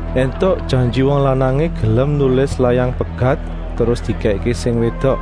“Entuk, janji wong lanangé gelem nulis layang pegat terus dikèkké sing wédok.”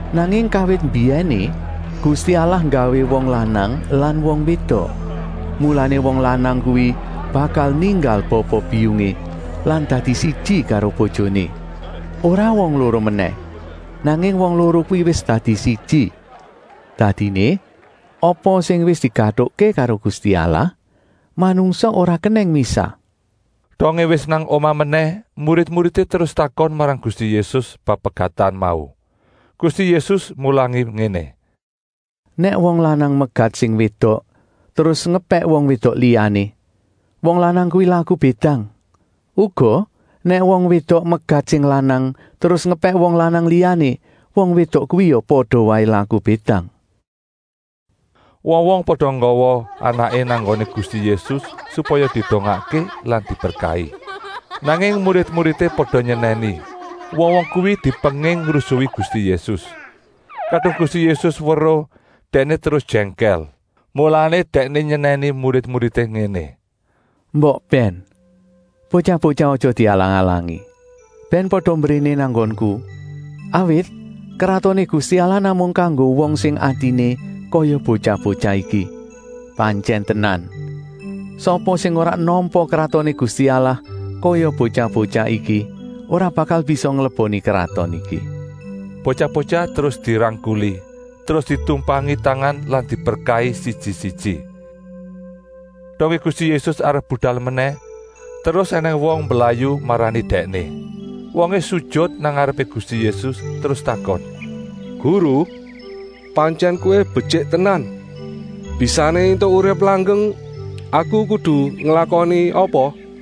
Nanging kawit mbiyèné Gusti Allah nggawé wong lanang lan wong wédok. Mulané wong lanang kuwi bakal ninggal bapa-biyungé lan dadi siji karo bojoné. Ora wong loro menèh, nanging wong loro kuwi wis dadi siji. Dadiné, apa sing wis digatukké karo Gusti Allah, manungsa ora kenèng misah.” Dongé wis nang omah menèh, murid-muridé terus takon marang Gusti Yésus bab pegatan mau. Gusti Yésus mulangi ngéné: “Nèk wong lanang megat sing wédok terus ngepèk wong wédok liyané, wong lanang kuwi laku bédang. Uga nèk wong wédok megat sing lanang terus ngepèk wong lanang liyané, wong wédok kuwi ya pada waé laku bédang.” Wong-wong pada nggawa anaké nang nggoné Gusti Yésus supaya didongakké lan diberkahi. Nanging murid-muridé pada nyenèni wong-wong kuwi dipenging ngrusui Gusti Yésus. Kadung Gusti Yésus weruh, dèkné terus jèngkèl. Mulané Dèkné nyenèni murid-muridé ngéné: “Mbok bèn! Botyah-botyah aja dialang-alangi. Bèn pada mbréné nang nggonku. Awit Kratoné Gusti Allah namung kanggo wong sing atiné kaya botyah-botyah iki. Pantyèn tenan, sapa sing ora nampa Kratoné Gusti Allah kaya botyah-botyah iki ora bakal bisa ngleboni kraton iki.” Botyah-botyah terus dirangkuli, terus ditumpangi tangan lan diberkahi siji-siji. Dongé Gusti Yésus arep budal menèh terus ènèng wong mblayu marani Dèkné. Wongé sujut nang ngarepé Gusti Yésus terus takon: “Guru, pantyèn Kowé betyik tenan. Bisané éntuk urip langgeng aku kudu nglakoni apa?”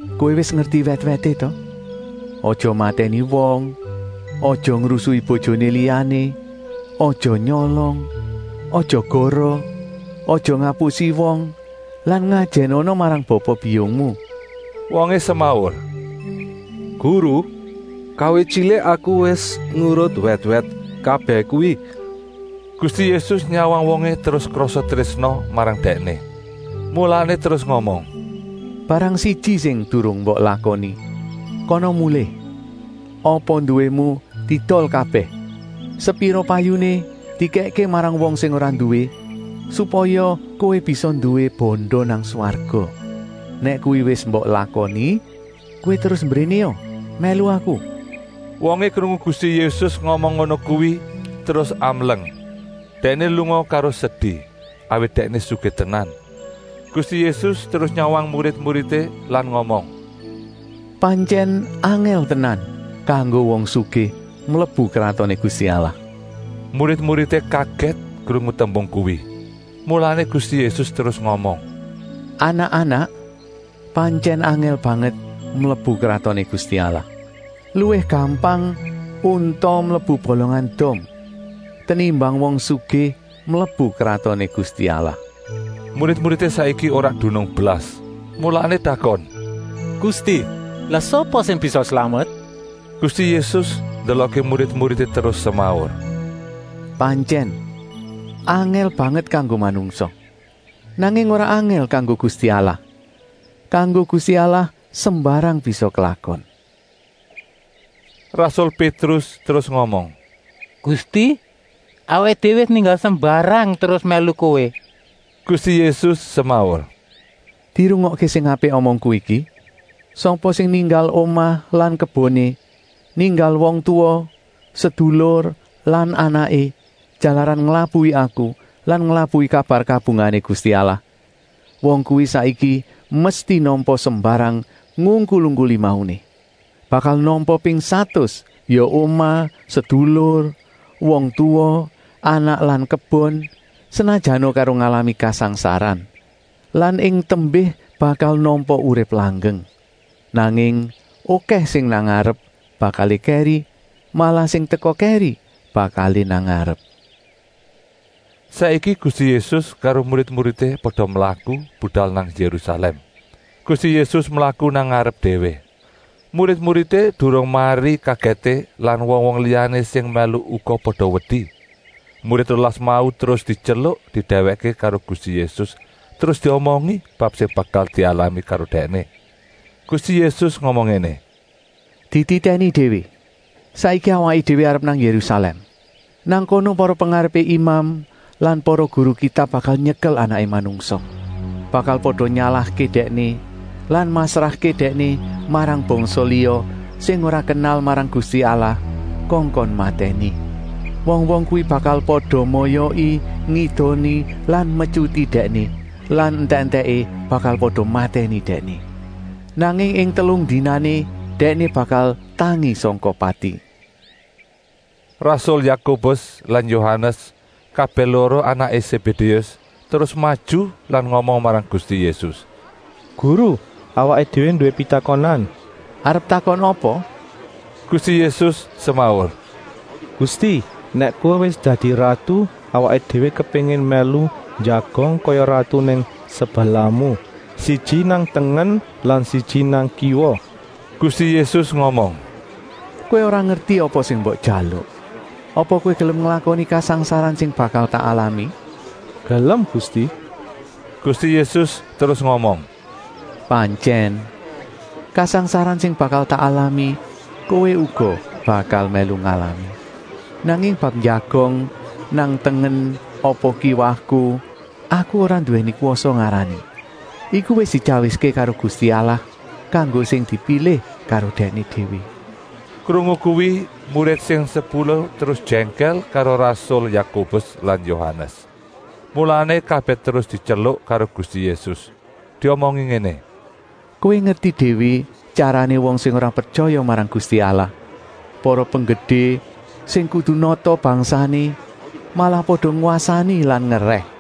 Kowé wis ngerti wèt-wèté ta? Aja matèni wong, aja ngrusui bojoné liyané, aja nyolong, aja goroh, aja ngapusi wong lan ngajènana marang bapa-biyungmu.” Wongé semaur: “Guru, kawit tyilik aku wis nurut wèt-wèt kabèh kuwi.” Gusti Yésus nyawang wongé terus krasa trésna marang dèkné, mulané terus ngomong: “Barang siji sing durung mbok lakoni: kana mulih, apa nduwému diedol kabèh. Sepira payuné dikèkké marang wong sing ora nduwé supaya kowé bisa nduwé banda nang swarga. Nèk kuwi wis mbok lakoni kowé terus mbrénéa mèlu Aku!” Wongé krungu Gusti Yésus ngomong ngono kuwi terus amleng. Dèkné lunga karo sedi, awit dèkné sugih tenan. Gusti Yésus terus nyawang murid-muridé ngomong: “Pantyèn angèl tenan kanggo wong sugih mlebu Kratoné Gusti Allah.” Murid-muridé kagèt krungu tembung kuwi. Mulané Gusti Yésus terus ngomong: “Anak-anak, pantyèn angèl banget mlebu Kratoné Gusti Allah. Luwih gampang unta mlebu bolongan dom, tenimbang wong sugih mlebu Kratoné Gusti Allah.” Murid-muridé saiki ora dunung blas, mulané takon: “Gusti, lah sapa sing bisa slamet?” Gusti Yésus ndelokké murid-muridé terus semaur: “Pantyèn, angèl banget kanggo manungsa, nanging ora angèl kanggo Gusti Allah. Kanggo Gusti Allah sembarang bisa klakon.” Rasul Pétrus terus ngomong: “Gusti, awaké déwé wis ninggal sembarang terus mèlu Kowé!” Gusti Yésus semaur: “Dirungokké sing apik omongku iki. Sapa sing ninggal omah lan keboné, ninggal wong tuwa, sedulur lan anaké jalaran nglabuhi Aku lan nglabuhi kabar kabungahané Gusti Allah, wong kuwi saiki mesti nampa sembarang ngungkul-ungkuli mauné. Bakal nampa ping satus, ya omah, sedulur, wong tuwa, anak lan kebon, senajana karo ngalami kasangsaran. Lan ing tembé bakal nampa urip langgeng. Nanging okèh sing nang ngarep bakalé kèri, malah sing teka kèri bakalé nang ngarep.” Saiki Gusti Yésus karo murid-muridé pada mlaku budal nang Yérusalèm. Gusti Yésus mlaku nang ngarep déwé. Murid-muridé durung mari kagèté lan wong-wong liyané sing mèlu uga pada wedi. Murid rolas mau terus dityeluk didèwèkké karo Gusti Yésus terus diomongi bab sing bakal dialami karo Dèkné. Gusti Yésus ngomong ngéné: “Dititèni déwé! Saiki awaké déwé arep nang Yérusalèm. Nang kono para pengarepé imam lan para guru Kitab bakal nyekel Anaké Manungsa. Bakal pada nyalahké Dèkné lan masrahké Dèkné marang bangsa liya sing ora kenal marang Gusti Allah kongkon matèni. Wong-wong kuwi bakal pada moyoki, ngidoni lan metyuti Dèkné lan entèk-entèké bakal pada matèni Dèkné. Nanging ing telung dinané Dèkné bakal tangi sangka pati.” Rasul Yakobus lan Yohanes, kabèh loro anaké Sébédéus, terus maju lan ngomong marang Gusti Yésus: “Guru, awaké déwé nduwé pitakonan.” “Arep takon apa?” Gusti Yésus semaur. “Gusti, nèk Kowé wis dadi ratu, awaké déwé kepéngin mèlu njagong kaya ratu nang sebelahmu, siji nang tengen lan siji nang kiwa.” Gusti Yésus ngomong: “Kowé ora ngerti apa sing mbok jaluk! Apa kowé gelem nglakoni kasangsaran sing bakal tak alami?” “Gelem Gusti!” Gusti Yésus terus ngomong: “Pantyèn, kasangsaran sing bakal tak alami kowé uga bakal mèlu ngalami. Nanging bab njagong nang tengen apa kiwaku aku ora nduwèni kwasa ngarani. Iku wis dityawiské karo Gusti Allah kanggo sing dipilih karo Dèkné déwé.” Krungu kuwi murid sing sepuluh terus jèngkèl karo rasul Yakobus lan Yohanes. Mulané kabèh terus dityeluk karo Gusti Yésus, diomongi ngéné: “Kowé ngerti déwé tyarané wong sing ora pretyaya marang Gusti Allah. Para penggedé sing kudu nata bangsané malah pada ngwasani lan ngerèh.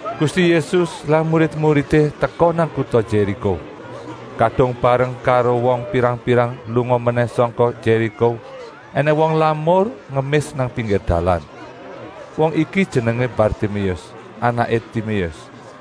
Gusti Yésus lan murid-muridé teka nang kuta Yériko. Kadung bareng karo wong pirang-pirang lunga menèh sangka Yériko, ènèng wong lamur ngemis nang pinggir dalan. Wong iki jenengé Bartiméus, anaké Timéus.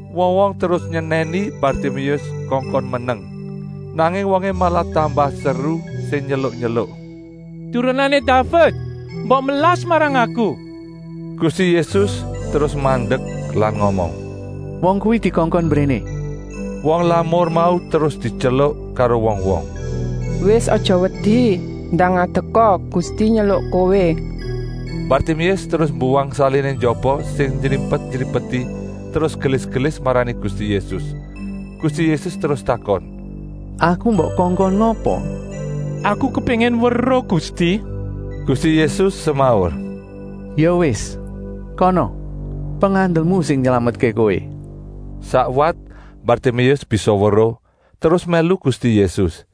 Wong-wong terus nyenèni Bartiméus kongkon meneng. Nanging wongé malah tambah seru sing tyeluk-tyeluk: “Turunané Daved, mbok melas marang aku!” Gusti Yésus terus mandek lan ngomong: “Wong kuwi dikongkon mbréné!” Wong lamur mau terus dityeluk karo wong-wong: “Wis aja wedi, ndang ngadeka. Gusti nyeluk kowé.” Bartiméus terus mbuwang saliné njaba sing nyrimpet-nyrimpeti terus gelis-gelis marani Gusti Yésus. Gusti Yésus terus takon: “Aku mbok kongkon ngapa?” “Aku kepéngin weruh, Gusti!” Gusti Yésus semaur: “Ya wis, kana! Pengandelmu sing nylametké kowé.” Sakwat Bartiméus bisa weruh terus mèlu Gusti Yésus.